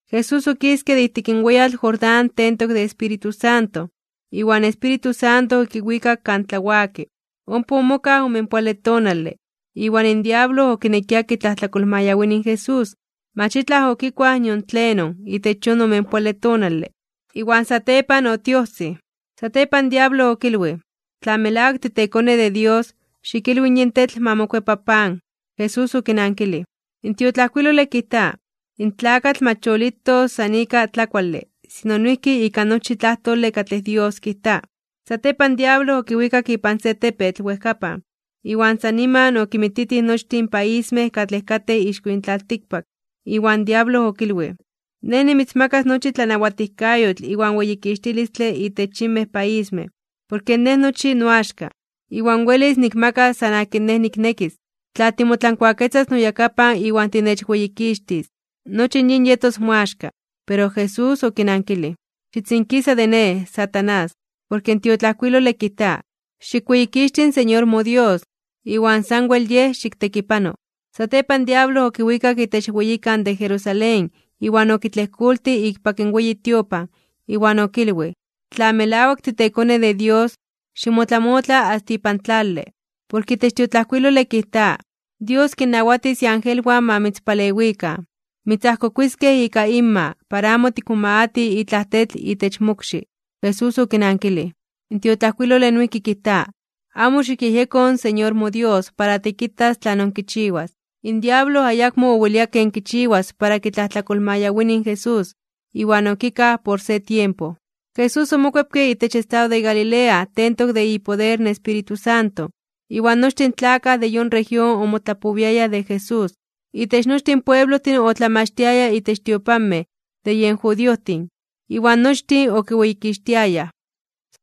Jesús okiske de ijtik in weyatl Jordán tentok de Espíritu Santo. Iwan in Espíritu Santo okiwikak kan tlawaki. Ompa omokaj omenpoale tonale, iwan in diablo okinekia kitlajtlakolmayawini in Jesús. Mach itlaj okikuaj nion tlenon itech yon omenpoale tonale, iwan satepan otiojsij. Satepan in diablo okilwij: ―Tla melawak titeKone de Dios, xikilwi in yin tetl ma mokuepa pan. Jesús okinankilij: ―In tiotlajkuilole kijta: “In tlakatl mach yolitos san ika tlakuale, sino noijki ika nochi tlajtole katlej Dios kijta.” Satepan in diablo okiwikak ipan se tepetl wejkapan, iwan san niman okinmititij nochtin in paismej katlej katej ixko yin tlaltikpak. Iwan in diablo okilwij: ―Nej nimitzmakas nochi tlanawatijkayotl iwan weyikixtilistle itech yinmej paismej. Porke nej nochi noaxka, iwan welis nikmakas san akin nej niknekis. Tla timotlankuaketzas noyakapan iwan tinechweyikixtis, nochi in yin yetos moaxka. Pero Jesús okinankilij: ―Xitzinkisa de Nej, Satanás, porke in tiotlajkuilole kijta: “Xikweyikixti in Señor moDios, iwan sanwel Yej xiktekipano.” Satepan in diablo okiwikak itech weyikan de Jerusalén iwan okitlejkoltij ikpak in weyi tiopan, iwan okilwij: ―Tla melawak titeKone de Dios, ximotlamotla asta ipan tlale. Porke itech in tiotlajkuilole kijta: Dios kinnawatis iangelwan ma mitzpalewikan. Mitzajkokuiskej ika inma, para amo tikmomagati itlaj tetl itech mokxi. Jesús okinankilij: ―In tiotlajkuilole noijki kijta: “Amo xikyejyeko in Señor moDios para tikitas tlanon kichiwas.” In diablo ayakmo owelia ken kichiwas para kitlajtlakolmayawini in Jesús, iwan okikaj por se tiempo. Jesús omokuepke itech estado de Galilea tentok de ipoder in Espíritu Santo, iwan nochtin in tlakaj de yon región omotlapowiayaj de Jesús. Itech nochtin pueblojtin otlamachtiaya itech tiopanmej de yen judiojtin, iwan nochtin okiweyikixtiayaj.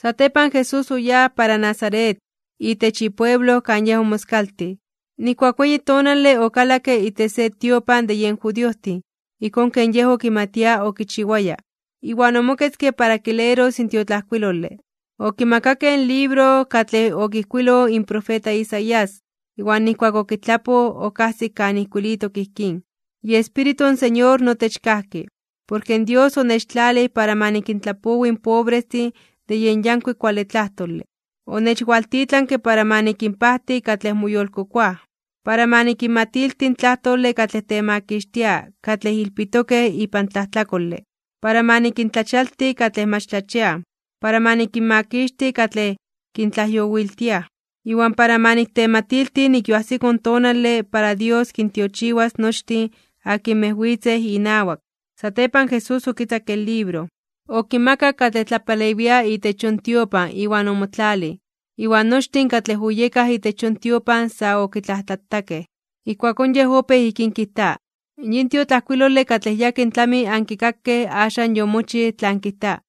Satepan Jesús oyáj para Nazaret, itech ipueblo kan Yej omoskaltij. Nijkuak weyi tonale okalakke itech se tiopan de yen judiojtin, ijkón ken Yej okimatia okichiwaya, iwan omoketzke para kileros in tiotlajkuilole. Okimakakej in libro katlej okijkuiloj in profeta Isaías. Iwan nijkuak okitlapoj, okajsik kan ijkuilitok ijkín: IEspíritu in Señor notech kajki, porke Dios onechtlalij para ma nikintlapowi in pobrestin de yen yankuik kuale tlajtole. Onechwaltitlanke para ma nikinpajti katlej moyolkokoaj, para ma nikinmatilti in tlajtole katlej temakixtia katlej ilpitokej ipan tlajtlakole, para ma nikintlachialti katlej mach tlachiaj, para ma nikinmakixti katlej kintlajyowiltiaj. Iwan para ma niktematilti nik yoajsiko in tonale para Dios kintiochiwas nochtin akinmej witzej inawak. Satepan Jesús okitzakke in libro, okimakak katlej tlapalewia itech yon tiopan iwan omotlalij. Iwan nochtin katlej oyekaj itech yon tiopan sa okitlajtlatakej. Ijkuakón Yej opéj ijkín kijta: ―Yin tiotlajkuilole katlej yakin tlami ankikakej axan yomochij tlan kijta.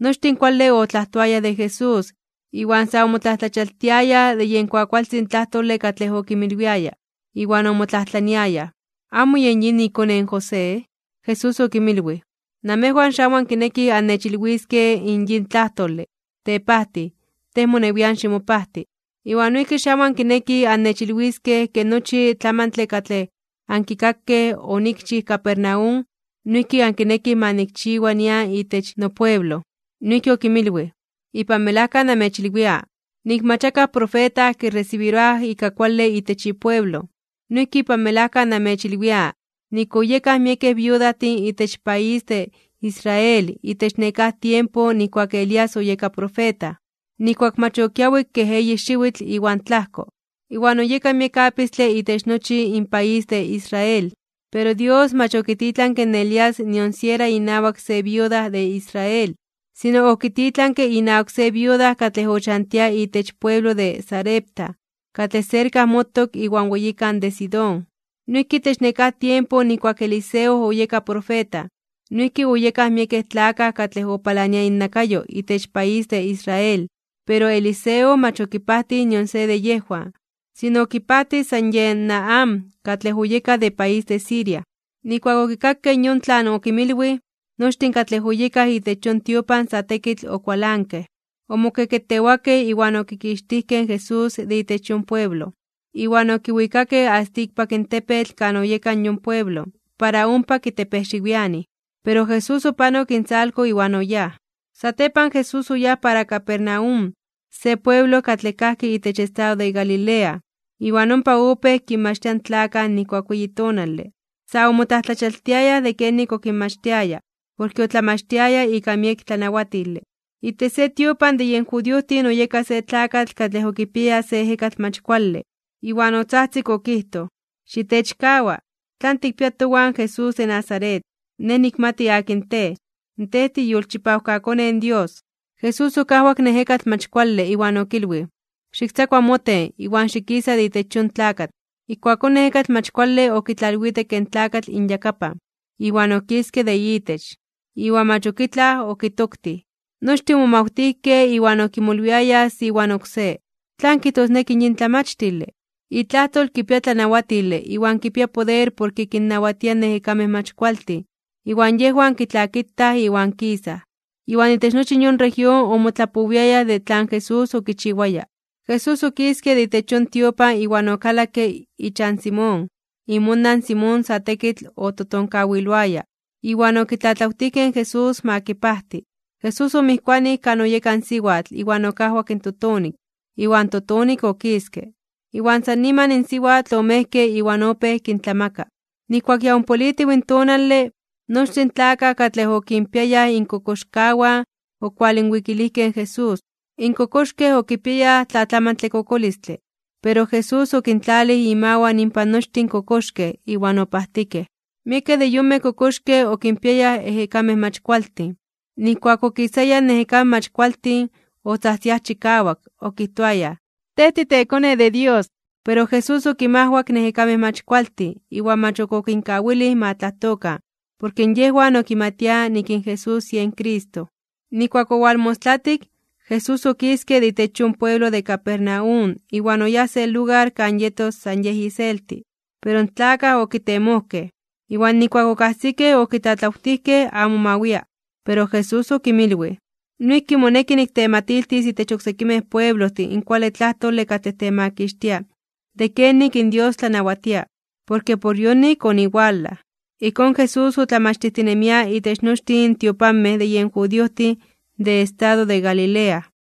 Nochtin kuale otlajtoayaj de Jesús, iwan sa omotlajtlachialtiayaj (omomajmawtiayaj) de yen kuakualtzin tlajtole katlej okinmilwiaya. Iwan omotlajtlaniayaj: ―¿Amo yen yin ikone in José? Jesús okinmilwij: ―Namejwan xamo ankinekij annechilwiskej in yin tlajtole: “Tepajtij, tej monewian ximopajti.” Iwan noijki xamo ankinekij annechilwiskej ke nochi tlamantle katlej ankikakej onikchij Capernaum, noijki ankinekij ma nikchiwa nian itech nopueblo. Noijki okinmilwij: ―Ipan melajka namechilwia, nik mach akaj profeta kiresibiroaj ika kuale itech ipueblo. Noijki ipan melajka namechilwia nik oyekaj miekej viudajtin itech país de Israel itech nekáj tiempo nijkuak Elías oyeka profeta, nijkuak mach okiawik kej eyi xiwitl iwan tlajko, iwan oyeka miek apistle itech nochi in país de Israel. Pero Dios mach okititlanke in Elías nion siera inawak se viuda de Israel, sino okititlanke inawak se viuda katlej ochantia itech pueblo de Sarepta, katlej serka motok iwan weyikan de Sidón. Noijki itech nekáj tiempo nijkuak Eliseo oyeka profeta, noijki oyekaj miekej tlakaj katlej opalania innakayo itech país de Israel. Pero Eliseo mach okipajtij nion se de yejwan, sino okipajtij san yen Naamán, katlej oyeka de país de Siria. Nijkuak okikakej yon tlan okinmilwij, nochtin katlej oyekaj itech yon tiopan sa tekitl okualankej. Omokeketewakej iwan okikixtijkej in Jesús de itech yon pueblo, iwan okiwikakej asta ikpak in tepetl kan oyeka yon pueblo, para ompa kitepejxiwianij. Pero Jesús opanok intzalko iwan oyáj. Satepan Jesús oyáj para Capernaum, se pueblo katlej kajki itech estado de Galilea, iwan ompa opéj kinmachtia in tlakaj nijkuak weyi tonale. Sa omotlajtlachialtiayaj (omomajmawtiayaj) de kenik okinmachtiaya, porke otlamachtiaya ika miek tlanawatile. Itech se tiopan de yen judiojtin oyeka se tlakatl katlej okipiaya se ejekatl mach kuale, iwan otzajtzik okijtoj: ―¡Xitechkawa! ¿Tlan tikpia towan, Jesús de Nazaret? Nej nikmati akin Tej. Tej tiiyolchipawkaKone in Dios. Jesús okajwak in ejekatl mach kuale, iwan okilwij: ―¡Xiktzakua moten, iwan xikisa de itech yon tlakatl! Ijkuakón in ejekatl mach kuale okitlalwitekke in tlakatl inyakapan, iwan okiske de itech, iwan mach ok itlaj okitoktij. Nochtin omomajmawtijkej, iwan okimolwiayaj se iwan oksé: ―¿Tlan kijtosneki yin tlamachtile? Itlajtol kipia tlanawatile iwan kipia poder porke kinnawatia in ejekamej mach kualtin, iwan yejwan kitlakitaj iwan kisaj. Iwan itech nochi yon región omotlapowiayaj de tlan Jesús okichiwaya. Jesús okiske de itech yon tiopan iwan okalakke ichan Simón. Imonan in Simón sa tekitl ototonkawiloaya, iwan okitlatlawtijkej in Jesús ma kipajti. Jesús omijkuanij kan oyeka in siwatl iwan okajwak in totonik, iwan totonik okiske. Iwan san niman in siwatl omejke iwan opéj kintlamaka. Nijkuak ya ompolitiw in tonale, nochtin in tlakaj katlej okinpiayaj inkokoxkawan okualinwikilijkej in Jesús. In kokoxkej okipiayaj tlatlamantle kokolistle, pero Jesús okintlalij imawan inpan nochtin kokoxkej iwan opajtikej. Miekej de yonmej kokoxkej okinpiayaj ejekamej mach kualtin. Nijkuak okisayaj in ejekamej mach kualtin, otzajtziaj chikawak, okijtoayaj: ―¡Tej titeKone de Dios! Pero Jesús okinmajwak in ejekamej mach kualtin iwan mach okinkawilij ma tlajtokan, porke yejwan okimatiaj nik in Jesús yen Cristo. Nijkuak owalmostlatik, Jesús okiske de itech yon pueblo de Capernaum iwan oyáj se lugar kan yetos san Yej iselti. Pero in tlakaj okitemojkej, iwan nijkuak okajsikej okitlatlawtijkej amo ma wia. Pero Jesús okinmilwij: ―Noijki moneki niktematiltis itech oksekimej pueblojtin in kuale tlajtole katlej temakixtia de kenik in Dios tlanawatia, porke por yonik oniwalaj. Ijkón, Jesús otlamachtijtinemia itech nochtin tiopanmej de yen judiojtin de estado de Galilea.